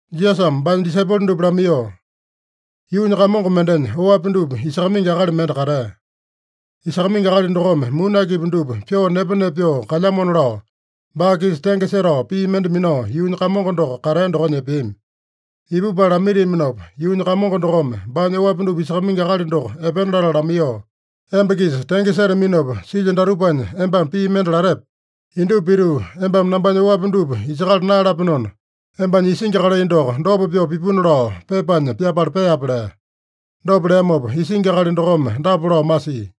Jisasame baanya disaipolo dupa lamaiyoo, “Yuunya kamongo mendenya oapi dupa isakamaingi akali mende katea. Isakamaingi akali dokome muni akipi dupa pyoo nepa-nepa pyoo kalyamona lao, baa-kisa tenge setao pii mende minao yuunya kamongo doko katea dokonya epeami. Ipupala lamaitiaminopa, yuunya kamongo dokome baanya oapi dupa isakamaingi akali doko epena latala lamaiyoo, ‘Emba-kisa tenge setaminopa silyo datupanya embame pii mende latepe? Indupa pituu embame nambanya oapi dupa isakala naeyalapenona, embanya isingi kalai doko dopa pyoo pipuna lao pepanya pyapala peape’ lea. Dopa leamopa isingi akali dokome dapa lao masia: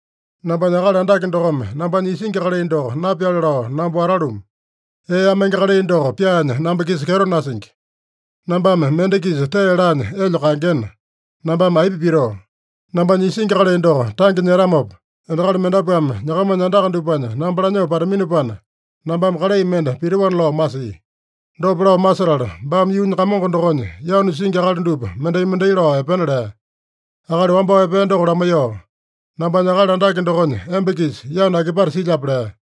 ‘Nambanya akali andake dokome nambanya isingi kalai doko napyale lao namba watalumu. Ee amenge kalai doko pyaanya namba-kisa kyeto nasingi. Nambame mende-kisa tee laanya elya kaengena, nambame aipa pitoo? Nambanya isingi kalai doko tange nyetamopa, endakali mendapuame nyakamanya andaka dupanya namba lanyoo pataminopana, nambame kalai mende pitoana’ lao masia. Dopa lao masetala, baame yuunya kamongo dokonya yanu singi akali dupa mendai-mendai lao epena lea. Akali wambao epea doko lamaiyoo, ‘Nambanya akali andake dokonya emba-kisa yanu akipate silyape?’ lea.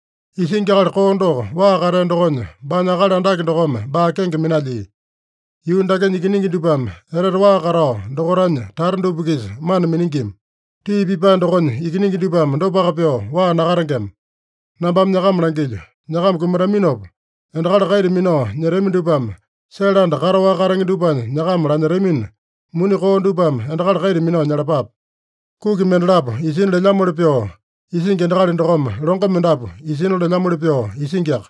Isingi akali koo doko waa katea dokonya, baanya akali andake dokome baa kenge minalyia. Yuu dakenya ikiningi dupame etete waa katao dokaitanya tata dupa-kisa mana miningima. Tii pipae dokonya ikiningi dupame dopaka pyoo waa nakatengema. Nambame nyakama langilyo: Nyakama kumataminopa, endakali kaita minao nyetami dupame sele anda kataowaka katenge dupanya nyakama lanyetamina, muni koo dupame endakali kaita minao nyalapape. “Kuki mendalapo isina lelyamoli pyoo isingi endakali dokome, longo mendapu isina lelyamoli pyoo isingiaka.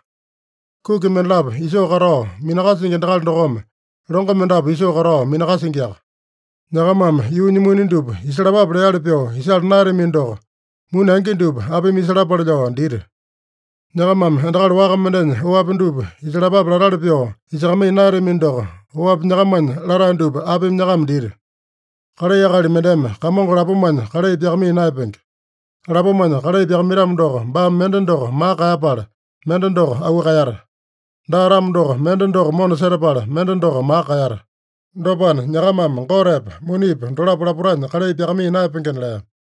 Kuki mendalapo isoo katao minakasingi endakali dokome, longo mendapu isoo katao minakasingiaka. Nyakamame yuunya muni dupa isalapape leali pyoo isala naeyatamino doko, muni angi dupa apimi isalapale lao dita? Nyakamame endakali waka mendenya oapi dupa isakalapape latali pyoo isakamaiya naeyatamino doko, oapi nyakamanya latae dupa apimi nyakama dita? Kalai akali mendeme kamongo lapomanya kalai pyakamaiya naeyapenge. Lapomanya kalai pyakamaitamo doko, baame mende doko maka kaeyapala, mende doko auu kaeyata. Daa-tamo doko, mende doko mona setapala, mende doko maka kaeyata. Dopana, nyakamame Gotepa, munipa dolapo lapotanya kalai pyakamaiya naeyapengena” lea.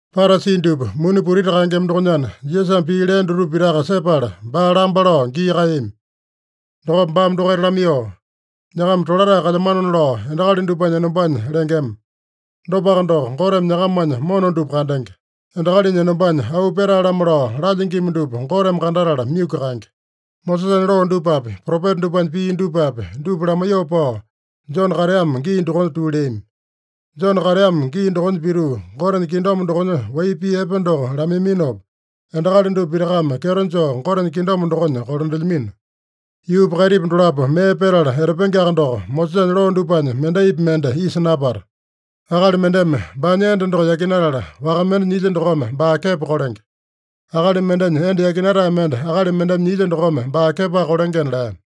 Parasi dupa muni putiti kaengema dokonyana, Jisasame pii lea dutupa pitaka sepala, baa lamba lao gii kaeyami. Dokopa baame dokaita lamaiyoo, “Nyakama tolatae kalyamanona lao endakali dupanya enombanya lengema. Dopaka doko, Goteme nyakamanya mona dupa kandenge. Endakalinya enombanya auu petae-lamo lao lalyingima dupa Goteme kandatala myuku kaenge. “Mosesanya loo dupapi, propeta dupanya pii dupapi, dupa lamaiyoo pao, Jone kateamo gii dokonya tuu leami. Jone kateamo gii dokonya pituu, Gotenya kingdom dokonya wai pii epe doko lamaiminopa, endakali dupa pitakame kyeto joo Gotenya kingdom dokonya kolandelyamino. Yuupa kaitipa dolapo mee petala etapengeaka doko, Mosesanya loo dupanya mendaipi mende isa napata. “Akali mendeme baanya enda doko yakinatala, waka mende nyilya dokome baa kepo kolenge. Akali mendenya enda yakinatae mende akali mendeme nyilya dokome baa kepoaka kolengena” lea.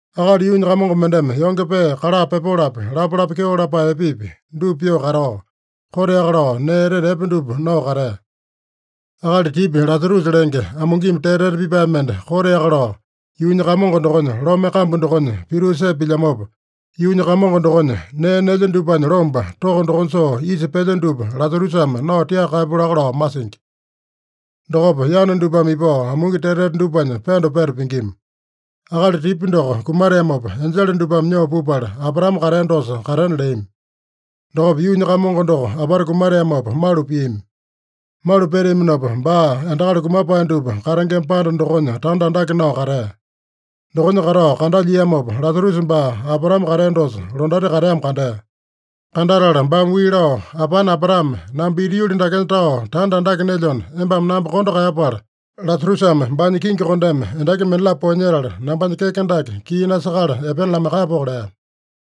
“Akali yuunya kamongo mendeme yonge pee kala pepolopi, lapalapa kyeo lapae epepi, dupa pyoo katao, koteaka lao nee etete epe dupa nao katea. Akali tipya Lasarusa lenge, amungimi tete-tete pipae mende koteaka lao, yuunya kamongo dokonya lome kambu dokonya pituu sepa pilyamopa, yuunya kamongo dokonya nee nelya dupanya lombo, toko dokonya soo isa pelya dupa Lasarusame nao tiaka kaeyapu laka lao masingi. Dokopa yana dupame ipao amungi tete-tete dupanya pendo peta pingima. Akali tipya doko kumateamopa, enjele dupame nyoo pupala, Abraame katea dosa katena leami. Dokopa yuunya kamongo doko apata kumateamopa malu piami. Malu peteaminopa, baa endakali kumapae dupa katengema panda dokonya tanda andake nao katea. Dokonya katao kandalyiamopa, Lasarusa baa Abraame katea dosa, londati kateamo kandea. Kandatala baame wii lao, ‘Apane Abraame, namba ita yuli dakenya tao tanda andake nelyona, embame namba kondo kaeyapala, Lasarusame baanya kingi kondeme endaki mendalapo poeyanyetala, nambanya keke dake kii nasakala epena lamaiyakapoko’ lea.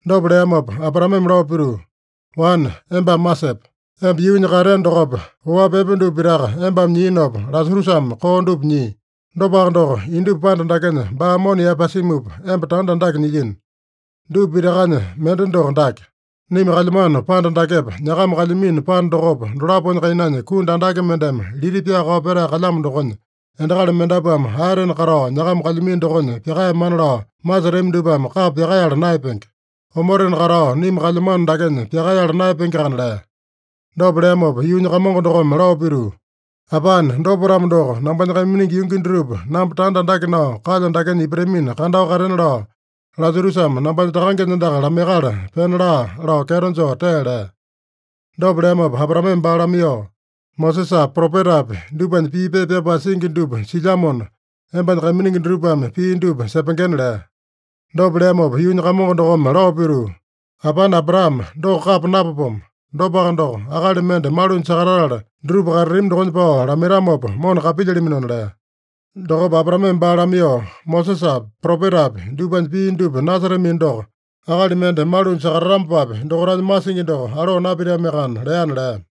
Dopa leamopa Abraameme lao pituu, ‘Wane, embame masepe: Emba yuunya kateeno dokopa, oapi epe dupa pitaka embame nyiinopa, Lasarusame koo dupa nyia. Dopaka doko, indupa panda dakenya baa mona yaepasimupa, emba tanda andake nyilyino. Dupa pitakanya mende doko dake: Naima kalyamano panda dakepa, nyakama kalyamino panda dokopa, dolaponya kainanya kundu andake mendeme lita pyakao petae kalyamo dokonya, endakali mendapuame aetena katao nyakama kalyamino dokonya pyakaeyamana lao masetami dupame kapa pyakaeyala naeyapenge. Omotena katao naima kalyamano dakenya pyakaeyala naeyapengeakana’ lea. Dopa leamopa yuunya kamongo dokome lao pituu, ‘Apane, dopa-tamo doko, nambanya kaiminingi yungi dutupa namba tanda andake nao kalyo dakenya ipatamina kandao katena lao, Lasarusame nambanya takangenya andaka lamaiyakala pena laa’ lao kyeto joo tee lea. Dopa leamopa Abraameme baa lamaiyoo, ‘Mosesapi, propetapi dupanya pii pepa pyapae singi dupa silyamona, embanya kaiminingi dutupame pii dupa sepengena’ lea. Dopa leamopa yuunya kamongo dokome lao pituu, ‘Apane Abraame, doko kapa napapomo. Dopaka doko, akali mende malunya sakatatala, dutupa katatami dokonya pao lamaitamopa, mona kapilyalaminona’ lea. Dokopa Abraameme baa lamaiyoo, ‘Mosesapi, propetapi dupanya pii dupa nasetamino doko, akali mende malunya sakatatamopapi, dokaitanya masingi doko aloo napitamiakana’ leana” lea.